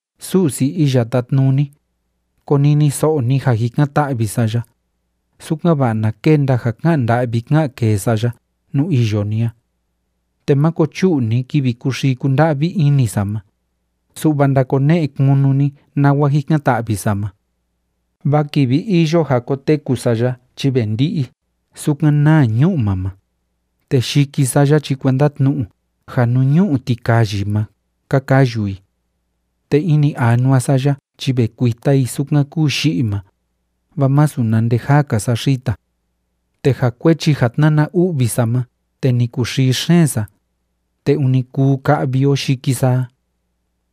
Su'si Iya Tátnuni, koniniso'o ni ja jikan‑ta'vi sa ya, sukan‑va'a na kenda ja ká'an nda'vi ká'an kee sa ya nuu iyo ni a. Te máko chu'u ni kivi kúxii kúnda'vi ini sa ma, su'va ndakone'e kunu ni nawa jikan‑ta'vi sa ma. Vaa kivi iyo ja koteku sa ya chi ve ndi'i sukan naa ñu'ma ma, te yiki sa ya chi kuenda tnu'u ja nuu ñu'u tikayi ma ka kayu i. Te ini anua sa ya chi ve kuita i sukan kúu yi'i ma, vaa masu na nde jaa‑ka sa xita. Te ja kuechi ja tnána u'vi sa ma te ni kuxii xeen sa, te ûni kuu ka'vi o yiki sa a.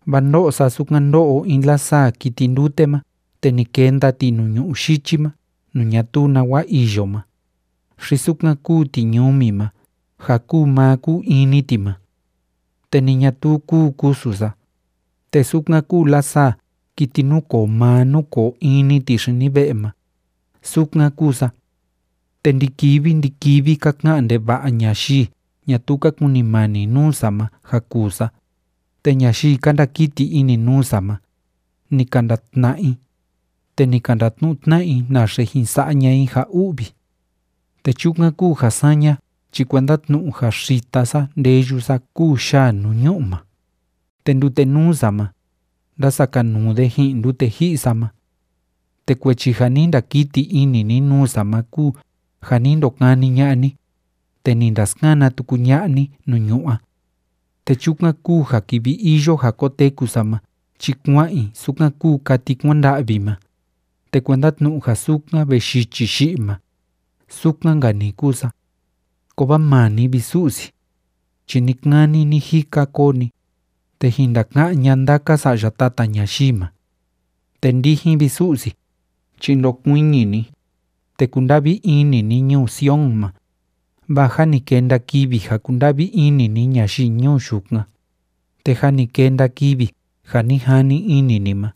Vaa ndó'o sa sukan ndó'o in lasaa kiti ndute ma te ni kenda ti nuu ñu'ú yichi ma nuu ñatuu nawa iyo ma, xi sukan kúu tiñumi ma ja kúu maa kúu in‑ni ti ma. Te ni ñatuu kúu kusu sa, te sukan kúu lasaa kiti núkoo maa núkoo in‑ni ti xini ve'e ma, sukan kúu sa. Te ndi‑kivi ndi‑kivi ka ka'an ndeva'a ñayii ñatuu ka kunimani nuu sa ma ja kuu sa, te ñayii ka ndakiti ini nuu sa ma, ni ka ndatna'a i, te ni ka ndatnu'u tna'a i naxe jin sa'a ña'a i ja u'vi. Te chukan kúu ja saña chi kuenda tnu'u ja xita sa ndeyu sa kúu yaa nuu ñu'u ma, te ndute nuu sa ma, ndásakanuu de ji'in ndute ji'i sa ma. Te kuechi ja ni ndakiti ini ni nuu sa ma kúu ja ni ndokani ña'a ni, te ni ndaskana tuku ña'a ni nuu ñu'ú a. Te chukan kúu ja kivi iyo ja koteku sa ma chi kua'an i sukan kúu kati kuanda'vi ma, te kuenda tnu'u ja sukan ve yichi yi'i ma, sukan‑nka‑ni kúu sa. Kovaa maa ni, vi Su'si, chi ni‑kani ni‑jika koo ni, te jin ndaka'án ña'a ndaka sa'ya tata ñayii ma. Te ndijin, vi Su'si, chi ndokuiñi ni, te kunda'vi ini ni ñuu Sion ma, vaa jâ ni kenda kivi ja kunda'vi ini ni ñayii ñuu yukan, te jâ ni kenda kivi ja ni jani ini ni ma.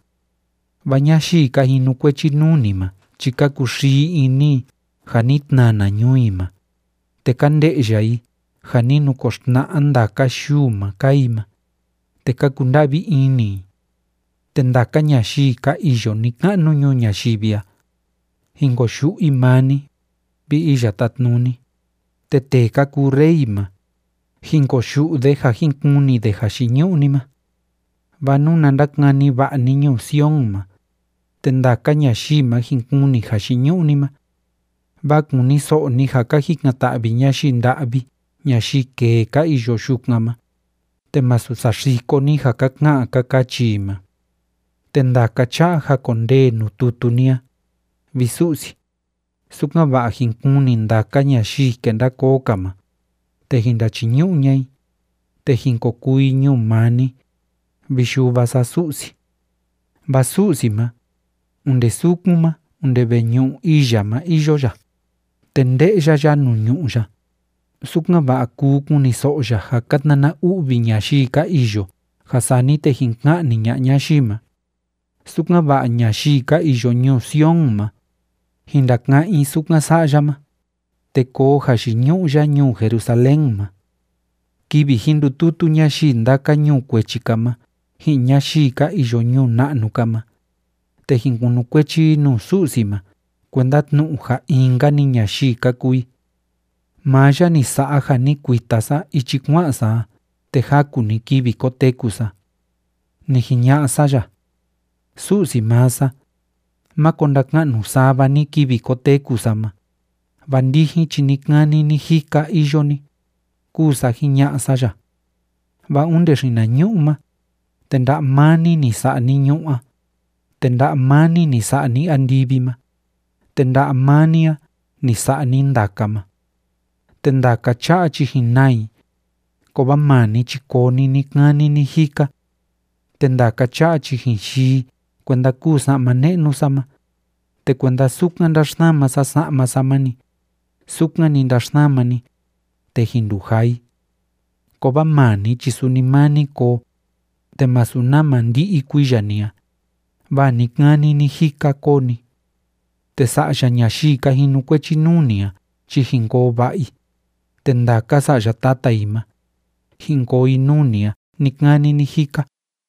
Vaa ñayii ka jinukuechi nuu ni ma chi ka kuxii ini i ja ni tnana ñuu i ma, te ka nde'ya i ja ni nukoxtna'a ndaka yuu ma kaa i ma, te ka kunda'vi ini i. Te ndaka ñayii ka iyo ni‑ka'nu ñuu ñayivi a, jin koyu'u i maa ni, vi Iya Tátnuni, te tee ka kuu rey ma, jin koyu'u de ja jin kuni de jayiñu'u ni ma. Vaa nuna ndakani va'a ni ñuu Sion ma, te ndaka ñayii ma jin kuni jayiñu'u ni ma. Vaa kuniso'o ni ja ka jikan‑ta'vi ñayii nda'vi ñayii kee ka iyo yukan ma, te masu saxiko ni ja ka ka'an ka kachi i ma. Te ndaka cha'a jakondee nuu tutu ni a, vi Su'si, sukan‑va'a jin kuni ndaka ñayii kenda koo‑ka ma, te jin ndachiñu'u ña'a i, te jin ko kuu i ñuu maa ni, vi Yuva sa Su'si. Vaa Su'si ma, onde sukun ma onde veñu'u ii ya ma iyo ya, te nde'ya ya nuu ñu'ú ya, sukan‑va'a kuu kuniso'o ya ja ka tnana u'vi ñayii ka iyo ja sani te jin ka'ni ña'a ñayii ma, sukan‑va'a ñayii ka iyo ñuu Sion ma, jin ndaka'án i sukan sa'a ya ma, te koo jayiñu'u ya ñuu Jerusalén ma. Kivi jin ndututu ñayii ndaka ñuu kuechi‑ka ma ji'in ñayii ka iyo ñuu na'nu‑ka ma, te jin kunukuechi i nuu Su'si ma kuenda tnu'u ja in‑nka‑ni ñayii ka kuu i. Maa ya ni sa'a ja ni kuita sa ichi kua'an sa a te jaku‑ni kivi koteku sa. Ni jiña'a sa ya: “Su'si maa sa, máko ndaka'nu sava ni kivi koteku sa ma, vaa ndijin chi ni‑kani ni‑jika iyo ni”, kúu sa jiña'a sa ya. Vaa onde xinañu'u ma, te nda'a maa ni, ni sa'a ni ñu'ú a, te nda'a maa ni, ni sa'a ni andivi ma, te nda'a maa ni a, ni sa'a ni ndaka ma. Te ndaka cha'a chi jin naa i, kovaa maa ni chi koo ni ni‑kani ni‑jika. Te ndaka cha'a chi jin yii i kuenda kúu sa'ma ne'nu sa ma, te kuenda sukan ndáxsama sa sa'ma sa ma‑ni, sukan‑ni ndaxsama ni, te jin ndujaa i. Kovaa maa ni chi suni maa ni koo, te masu nama ndi'i kuiya ni a, vaa ni‑kani ni‑jika koo ni. Te sa'ya ñayii ka jinukuechi nuu ni a chi jin koo va'a i, te ndaka sa'ya tata i ma, jin koo i nuu ni a ni‑kani ni‑jika.